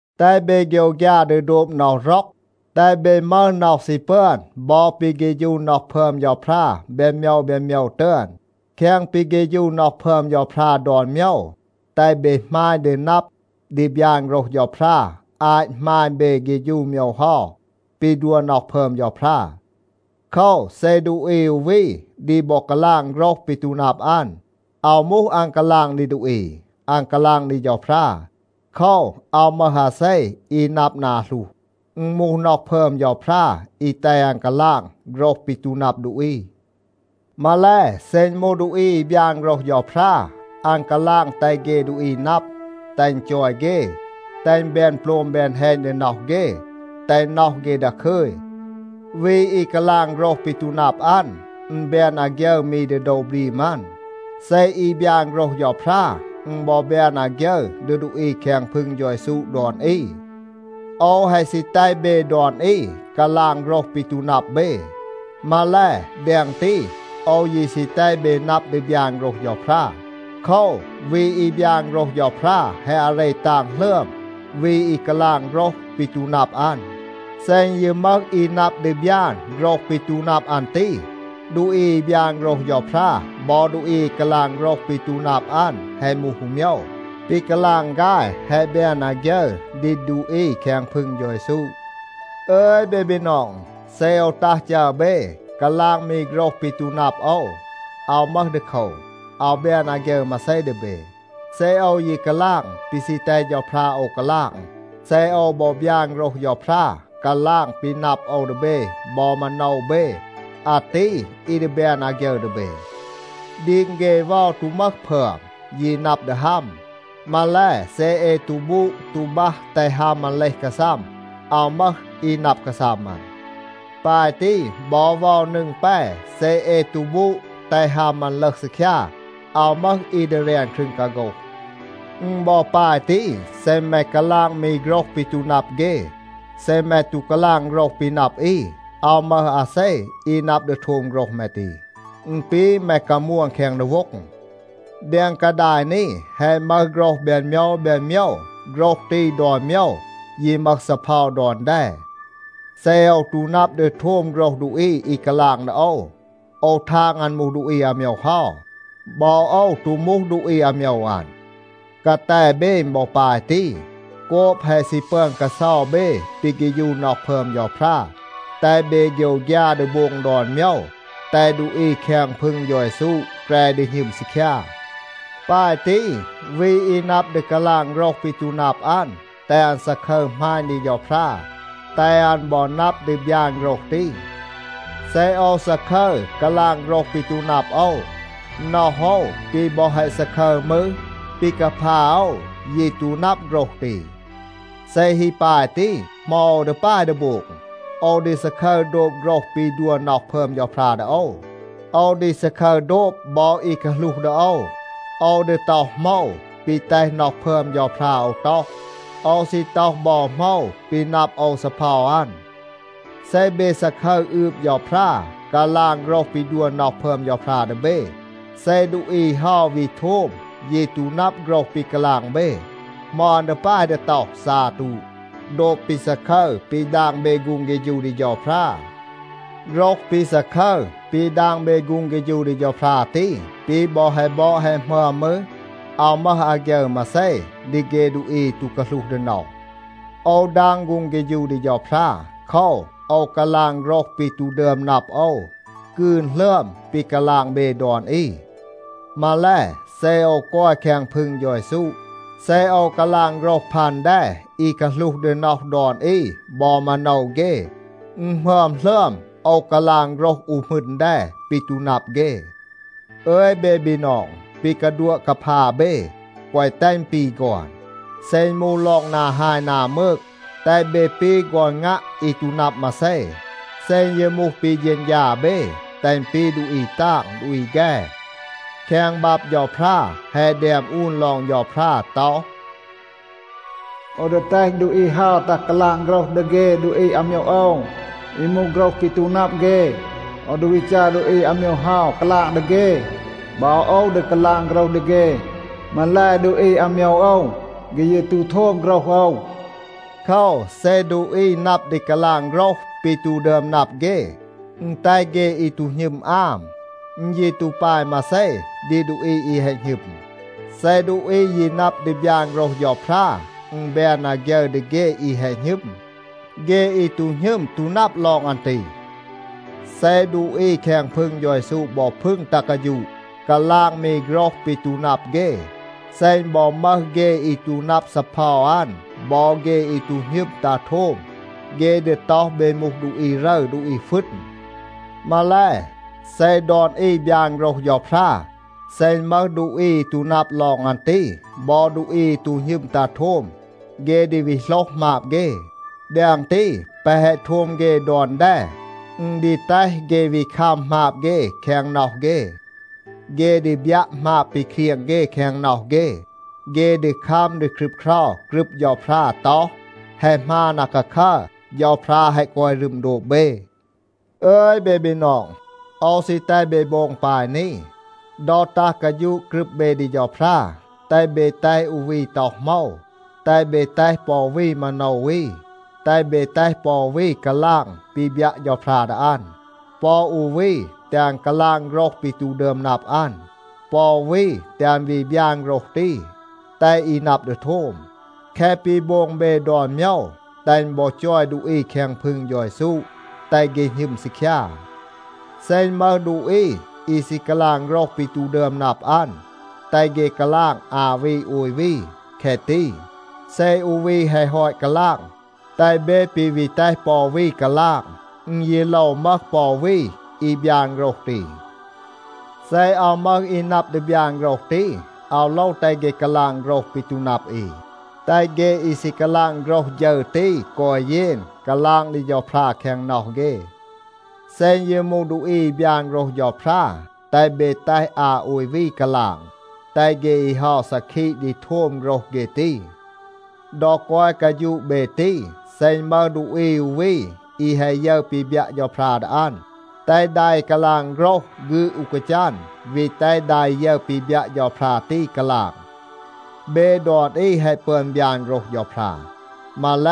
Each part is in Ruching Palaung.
แตห เบ โฆยวฆยา ดี โดบ น็อห ร็อก. แตห เบ มึห น็อห ซี ปึอน บอ ปี เฆฌู น็อห พึอม เฌาพรา แบน โมยว แบน โมยว ตึอน. แคง ปี เฆฌู น็อห พึอม เฌาพรา ดอน โมยว, แตห เบ หมาณ ดี นับ ดี บยาน โฆรห เฌาพรา อาต หมาณ เบ เฆฌู โมยว เฮา ปี ดัว น็อห พึอม เฌาพรา. โคว, เซ ดูอี อู วี ดี บอ กาลาง โฆรห ปี ตู นับ อัน, อาว มูห อัน กาลาง ดี ดูอี, อัน กาลาง ดี เฌาพรา. โคว, อาว มึห อาเซ อี นับ นา หลูห. อึณ มูห น็อห พึอม เฌาพรา อี แตห อัน กาลาง โฆรห ปี ตู นับ ดูอี. มาแล, เซ อึณ มูห ดูอี อี บยาน โฆรห เฌาพรา, อัน กาลาง แตห เฆ ดูอี นับ, แตห อึณ จอย เฆ, แตห อึณ แบน โปลม แบน แฮณ ดี น็อห เฆ, แตห น็อห เฆ ดาคึย. วี อี กาลาง โฆรห ปี ตู นับ อัน, อึณ แบน อาฆยึร มี ดี โดว บรีม อัน. เซ อี บยาน โฆรห เฌาพรา, อึณ บอ แบน อาฆยึร ดี ดูอี แคง พึง เฌา เยซู ดอน อี. โอว แฮะ ซี แตห เบ ดอน อี กาลาง โฆรห ปี ตู นับ เบ. มาแล, แดง ตี, โอว ยี ซี แตห เบ นับ ดี บยาน โฆรห เฌาพรา. โคว, วี อี บยาน โฆรห เฌาพรา แฮะ อาเร ตาง หลึอม วี อี กาลาง โฆรห ปี ตู นับ อัน. เซ อึณ ยี มึห อี นับ ดี บยาน โฆรห ปี ตู นับ อัน ตี, ดูอี อี บยาน โฆรห เฌาพรา บอ ดูอี อี กาลาง โฆรห ปี ตู นับ อัน แฮะ มูห อู โมยว. ปี กาลาง ฆาย แฮะ แบน อาฆยึร ดี ดูอี แคง พึง เฌา เยซู. อึย เบ บีนอง, เซ โอว ตัห จัร เบ, กาลาง มี โฆรห ปี ตู นับ โอว, อาว มึห ดีโคว. อาว แบน อาฆยึร มาเซ ดี เบ. เซ โอว ยี กาลาง ปี ซี แตห เฌาพรา โอว กาลาง, เซ โอว บอ บยาน โฆรห เฌาพรา, กาลาง ปี นับ โอว ดี เบ บอ มาโนว เบ, อาตี อี ดี แบน อาฆยึร ดี เบ. ดีง เฆ เวา ตู มึห พึอม, ยี นับ ดี ฮัม. มาแล, เซ เอ ตู บูด ตู บัห แตห ฮัม อัน เลห กาซัม, อาว มึห อี นับ กาซัม อัน. ปาย ตี, บอ เวา นึง แป, เซ เอ ตู บูด แตห ฮัม อัน ลึห ซีคยา, อาว มึห อี ดี แรน ครึง กาโฆห. อึณ บอ ปาย ตี, เซ แม กาลาง มี โฆรห ปี ตู นับ เฆ. เซ แม ตู กาลาง โฆรห ปี นับ อี, อาว มึห อาเซ อี นับ ดี โทม โฆรห แม ตี. อึณ ปี แม กามวน แคง ดีโว็ง. แดง กาดาย นี, แฮะ มึห โฆรห แบน โมยว แบน โมยว. โฆรห ตี ดอน โมยว ยี มึห ซีเพา ดอน แด. เซ โอว ตู นับ ดี โทม โฆรห ดูอี อี กาลาง ดี โอว, โอว ทาง อัน มูห ดูอี อาโมยว เฮา. บอ โอว ตู มูห ดูอี อาโมยว อัน. กาแต เบ อึณ บอ ปาย ตี. โกบ แฮะ ซี ปึอน กาเซา เบ ปี เฆฌู น็อห พึอม เฌาพรา, แตห เบ โฆยวฆยา ดี โบง ดอน โมยว, แตห ดูอี แคง พึง เฌา เยซู แกร ดี หณึม ซีคยา. ปาย ตี, วี อี นับ ดี กาลาง โฆรห ปี ตู นับ อัน, แตห อัน ซาคึร หมาณ ดี เฌาพรา, แตห อัน บอ นับ ดี บยาน โฆรห ตี. เซ โอว ซาคึร กาลาง โฆรห ปี ตู นับ โอว, น็อห โอว ปี บอ แฮะ ซาคึร มืร, ปี กาพา โอว ยี ตู นับ โฆรห ตี. เซ ฮี ปาย ตี, เหมา โอว ดี ปาย ดี โบง? โอว ดี ซาคึร โดบ โฆรห ปี ดัว น็อห พึอม เฌาพรา ดี โอว. โอว ดี ซาคึร โดบ บอ อี กาหลูห ดี โอว. โอว ดี ต็อห โหมว ปี แตห น็อห พึอม เฌาพรา โอว ต็อห. โอว ซี ต็อห บอ โหมว ปี นับ โอว ซีเพา อัน. เซ เบ ซาคึร อืบ เฌาพรา, กาลาง โฆรห ปี ดัว น็อห พึอม เฌาพรา ดี เบ, เซ ดูอี เฮา วี โทม ยี ตู นับ โฆรห ปี กาลาง เบ, เหมา อัน ดี ปาย ดี ต็อห, “ซาตู” โดบ ปี ซาคึร ปี ดาง เบ ฆูง เฆฌู ดี เฌาพรา. โฆรห ปี ซาคึร ปี ดาง เบ ฆูง เฆฌู ดี เฌาพรา ตี ปี บอ แฮะ บอด แฮะ หมึอม มืร, อาว มึห อาฆยึร มาเซ ดี เฆ ดูอี อี ตู กาหลูห ดี น็อห. โอว ดาง ฆูง เฆฌู ดี เฌาพรา. โคว, โอว กาลาง โฆรห ปี ตู ดึอม นับ โอว กืน หลึอม ปี กาลาง เบ ดอน อี. มาแล, เซ โอว กอย แคง พึง เฌา เยซู, เซ โอว กาลาง โฆรห พัน แด อี กาหลูห ดี น็อห ดอน อี บอ มาโนว เฆ, อึณ หมึอม หลึอม โอว กาลาง โฆรห อู หมึณ แด ปี ตู นับ เฆ. อึย เบ บีนอง, ปี กาดัวะ กาพา เบ, แกวะ แตห อึณ ปี ฆอน. เซ อึณ มูห ลอง นา ฮาย นา มืก, แตห เบ ปี ฆอน งัะ อี ตู นับ มาเซ. เซ อึณ ยี มูห ปี เฌณฌา เบ, แตห อึณ ปี ดูอี ตาง ดูอี แฆ. แคง บับ เฌาพรา แฮะ แดม อูน ลอง เฌาพรา ต็อห, “โอว ดี แตห ดูอี เฮา ตัห กาลาง โฆรห ดี เฆ ดูอี อาโมยว โอว อี มูห โฆรห ปี ตู นับ เฆ. โอว ดี วี จัร ดูอี อาโมยว เฮา กาลาง ดี เฆ. บอ โอว ดี กาลาง โฆรห ดี เฆ. มาแล, ดูอี อาโมยว โอว, เฆ ยี ตู โทม โฆรห โอว.” โคว, เซ ดูอี นับ ดี กาลาง โฆรห ปี ตู ดึอม นับ เฆ, อึณ แตห เฆ อี ตู หณึม อาม. อึณ ยี ตู ปาย มาเซ ดี ดูอี อี แฮะ หณึม. เซ ดูอี ยี นับ ดี บยาน โฆรห เฌาพรา, อึณ แบน อาฆยึร ดี เฆ อี แฮะ หณึม. เฆ อี ตู หณึม ตู นับ ลอง อัน ตี. เซ ดูอี แคง พึง เฌา เยซู บอ พึง ตัห กาฌูะ, กาลาง มี โฆรห ปี ตู นับ เฆ, เซ อึณ บอ มึห เฆ อี ตู นับ ซีเพา อัน บอ เฆ อี ตู หณึม ตัห โทม, เฆ ดี ต็อห เบ มูห ดูอี รึร ดูอี ฟึณ. มาแล, เซ ดอน อี บยาน โฆรห เฌาพรา, เซ อึณ มึห ดูอี อี ตู นับ ลอง อัน ตี, บอ ดูอี อี ตู หณึม ตัห โทม, เฆ ดี วี โหลห หมาบ เฆ. แดง ตี, แปะ แฮะ โทม เฆ ดอน แด, อึณ ดี แตห เฆ วี คัม หมาบ เฆ แคง น็อห เฆ. เฆ ดี บยัะ หมาบ ปี เครียง เฆ แคง น็อห เฆ. เฆ ดี คัม ดี ครึบเครา กรึบ เฌาพรา ต็อห, “แฮะ หมาน อาคาคัร. เฌาพรา แฮะ กอย รึม โดบ เบ.” อึย เบ บีนอง, โอว ซี แตห เบ โบง ปาย นี. ดอ ตัห กาฌูะ กรึบ เบ ดี เฌาพรา, แตห เบ แตห อู วี ต็อห โหมว, แตห เบ แตห ปอ อู วี มาโนว อี. แตห เบ แตห ปอ อู วี กาลาง ปี บยัะ เฌาพรา ดี อัน. ปอ อู วี, แตห อัน กาลาง โฆรห ปี ตู ดึอม นับ อัน, ปอ อู วี, แตห อัน วี บยาน โฆรห ตี, แตห อี นับ ดี โทม. แคะ ปี โบง เบ ดอน โมยว, แตห อึณ บอ จอย ดูอี แคง พึง เฌา เยซู, แตห เฆ หณึม ซีคยา. เซ อึณ มึห ดูอี อี ซี กาลาง โฆรห ปี ตู ดึอม นับ อัน, แตห เฆ กาลาง อา วี โอย วี, แคะ ตี. เซ อู วี แฮะ ฮอต กาลาง, แตห เบ ปี วี แตห ปอ อู วี กาลาง. อึณ ยี โลว มึห ปอ อู วี อี บยาน โฆรห ตี. เซ อาว มึห อี นับ ดี บยาน โฆรห ตี, อาว โลว แตห เฆ กาลาง โฆรห ปี ตู นับ อี. แตห เฆ อี ซี กาลาง โฆรห ฌึร ตี กอย เยน, กาลาง ดี เฌาพรา แคง น็อห เฆ. เซ อึณ ยี มูห ดูอี อี บยาน โฆรห เฌาพรา, แตห เบ แตห อา โอย วี กาลาง. แตห เฆ อี เฮา ซาคีะ ดี โทม โฆรห เฆ ตี. ดอ กอย กาฌูะ เบ ตี, เซ อึณ มึห ดูอี อู วี อี แฮะ ยึร ปี บยัะ เฌาพรา ดี อัน, แตห ดา อี กาลาง โฆรห ฆืด อู กาจัน, วี แตห ดา อี ยึร ปี บยัะ เฌาพรา ตี กาลาง. เบ ดอน อี แฮะ ปึอน บยาน โฆรห เฌาพรา. มาแล,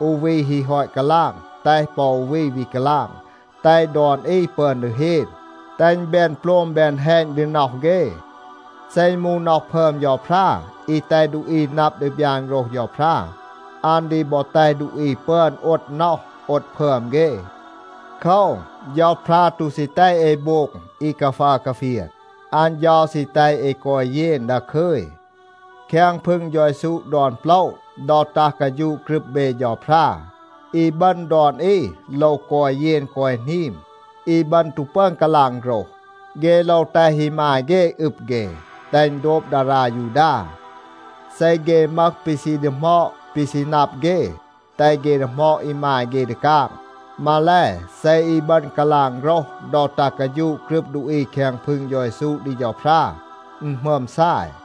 อู วี ฮี ฮอต กาลาง, แตห ปอ อู วี วี กาลาง, แตห ดอน อี ปึอน ดี เฮน, แตห อึณ แบน โปลม แบน แฮณ ดี น็อห เฆ. เซ อึณ มูห น็อห พึอม เฌาพรา อี แตห ดูอี นับ ดี บยาน โฆรห เฌาพรา, อัน ดี บอ แตห ดูอี ปึอน โอด น็อห, โอด พึอม เฆ. โคว, เฌาพรา ตู ซี แตห เอ โบง อี กาฟัร กาเฟียน. อัน เฌา ซี แตห เอ กอย เยน ดาคึย. แคง พึง เฌา เยซู ดอน โปละ, ดอ ตัห กาฌูะ กรึบ เบ เฌาพรา, อีบึณ ดอน อี โลว กอย เยน กอย หนีม. อีบึณ ตู ปึอน กาลาง โฆรห. เฆ โลว แตห อีมาย เฆ อึบ เฆ, แตห อึณ โดบ ดารา ยูดา. เซ เฆ มึห ปี ซี ดีหมอด ปี ซี นับ เฆ, แตห เฆ ดีหมอด อีมาย เฆ ดี กาง. มาแล, เซ อีบึณ กาลาง โฆรห ดอ ตัห กาฌูะ กรึบ ดูอี แคง พึง เฌา เยซู ดี เฌาพรา, อึณ หมึอม ซาย.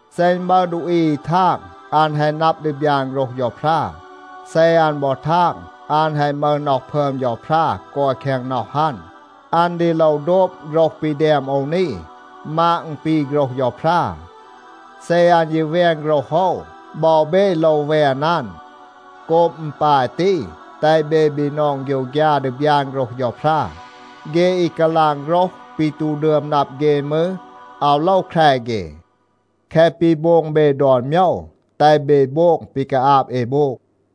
เซ อึณ มึห ดูอี อี ทาง อัน แฮะ นับ ดี บยาน โฆรห เฌาพรา, เซ อัน บอ ทาง อัน แฮะ มึห น็อห พึอม เฌาพรา กอย แคง น็อห อัน, อัน ดี โลว โดบ โฆรห ปี แดม โอว นี, มาด อึณ ปี โฆรห เฌาพรา. เซ อัน ยี แวน โฆรห โอว, บอ เบ โลว แวน อัน. โกบ อึณ ปาย ตี, แตห เบ บีนอง โฆยวฆยา ดี บยาน โฆรห เฌาพรา. เฆ อี กาลาง โฆรห ปี ตู ดึอม นับ เฆ มืร, อาว โลว แคร เฆ. แคะ ปี โบง เบ ดอน โมยว, แตห เบ โบง ปี กาอาบ เอ โบง.